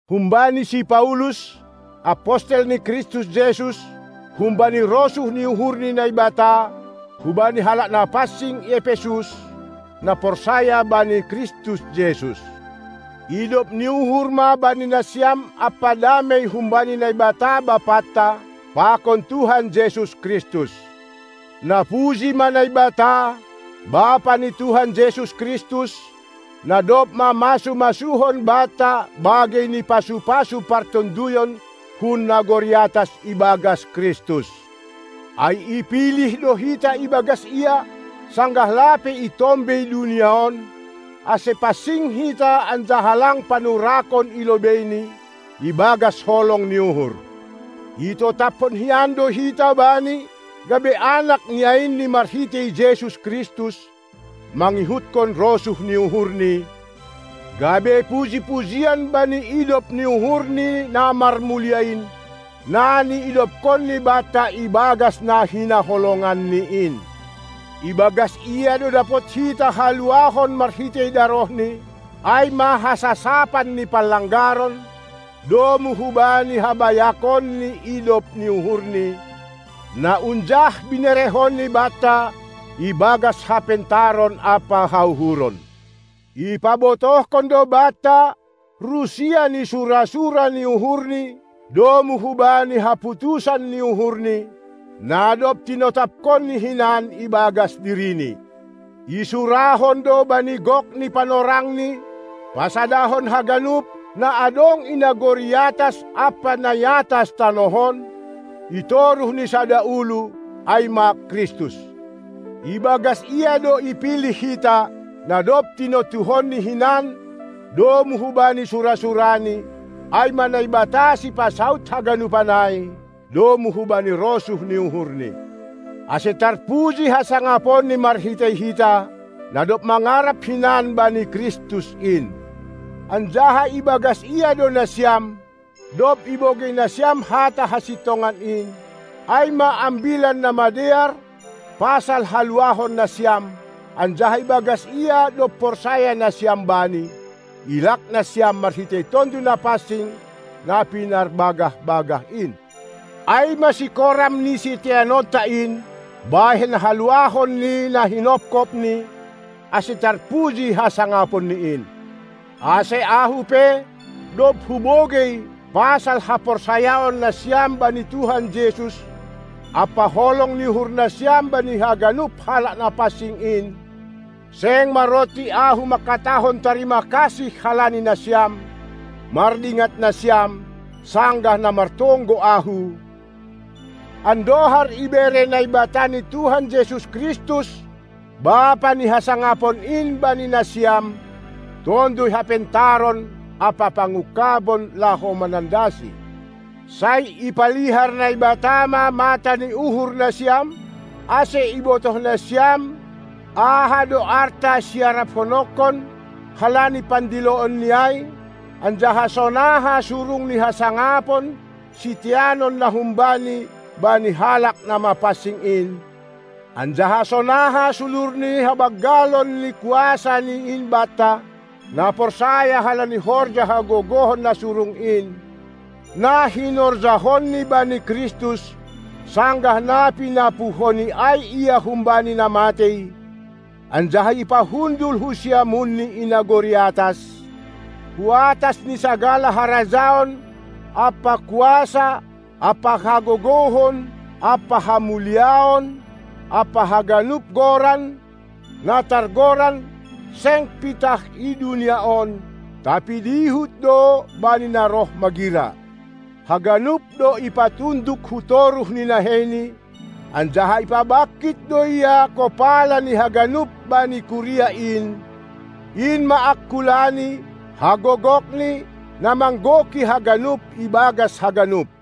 Humbani si Paulus, apostel ni Kristus Jesus, humbani rosuh ni uhur ni Naibata, hubani halak na pansing i Epesus, na porsaya bani Kristus Jesus. Idop ni uhur ma bani nasiam ampa damei humbani Naibata Bapanta, pakon Tuhan Jesus Kristus. Napuji ma Naibata, Bapa ni Tuhan Jesus Kristus, na dob mamasu-masuhon banta bagei ni pasu-pasu partonduyon hun nagori atas ibagas Kristus. Ai ipilih do hita ibagas Ia, sanggah lape itombei dunia on, ase pansing hita anjaha lang panurakon i lobeiNi, ibagas holong ni uhur. Itotapkon hinan do hita Bani, gabe anak niainNi marhitei Jesus Kristus, mangihutkon rosuh ni uhurNi, gabe puji-pujian bani idop ni uhur ni na marmulia in, na niidopkonNi banta ibagas na Hinaholonganni in. Ibagas Ia do dapot hita haluahon marhitei darohNi, ai ma hasasapan ni panlanggaron, domu hubani habayakon ni idop uhurNi, na unjah binerehonni banta ibagas hapentaron ampa hauhuron. Ipabotohkon do banta rusia ni sura-sura ni uhurNi domu hubani haputusan ni uhurNi, na dob tinotaphonNi hinan ibagas DiriNi. Isurahon do bani gok ni panorangni, pasadahon haganup, na adong i nagori atas ampa na iatas tanoh on, itoruh ni sada ulu, ai ma Kristus. Ibagas Ia do ipilih hita, na dob tinontuhonNi hinan domu hubani sura-suraNi, ai ma Naibata sipasaud haganupan ai, domu hubani rosuh ni uhurNi, ase tarpuji hasangaponNi marhitei hita, na dob mangarap hinan bani Kristus in. Anjaha ibagas Ia do nasiam, dob ibogei nasiam hata hasintongan in, ai ma Ambilan Namadear pasal haluahon nasiam, anjaha ibagas Ia dob porsaya nasiam Bani, ilak nasiam marhitei Tonduy Napansing, na pinarbagah-bagah in, ai ma sikoram ni siteanonta in, bahen haluahon ni na hinophopNi, ase tarpuji hasangaponNi in. Ase ahu pe, dob hubogei, pasal haporsayaon nasiam bani Tuhan Jesus ampa holong ni uhur nasiam bani haganup halak na pansing in, seng maronti ahu mangkatahon tarima kasih halani nasiam, mardingat nasiam, sanggah na martonggo ahu, andohar ibere Naibata ni Tuhanta Jesus Kristus, Bapa ni hasangapon in bani nasiam Tonduy hapentaron ampa pangungkabon, laho manandaSi. Sai ipalihar Naibata ma mata ni uhur nasiam, ase ibotoh nasiam aha do arta siaraphononkon halani pandiloonNi ai, anjaha sonaha surung ni hasangapon, siteanon na hum Bani, bani halak na mapansing in; anjaha sonaha sulur ni habanggalon ni KuasaNi in banta, na porsaya halani horja hagogohon na surung in, na hinorjahonNi bani Kristus, sanggah na pinapuhoNi ai Ia humbani na matei, anjaha ipahundul hu siamunNi i nagori atas, hu atas ni sagala harajaon ampa kuasa ampa hagogohon ampa hamuliaon, ampa haganup goran, na targoran, seng pitah i dunia on, tapi dihut do bani na roh magira. Haganup do ipatunduk hu toruh ni naheiNi, anjaha ipabangkit do Ia kopala ni haganup, bani kuria in, in ma angkulaNi, hagogokNi, na manggoki haganup ibagas haganup.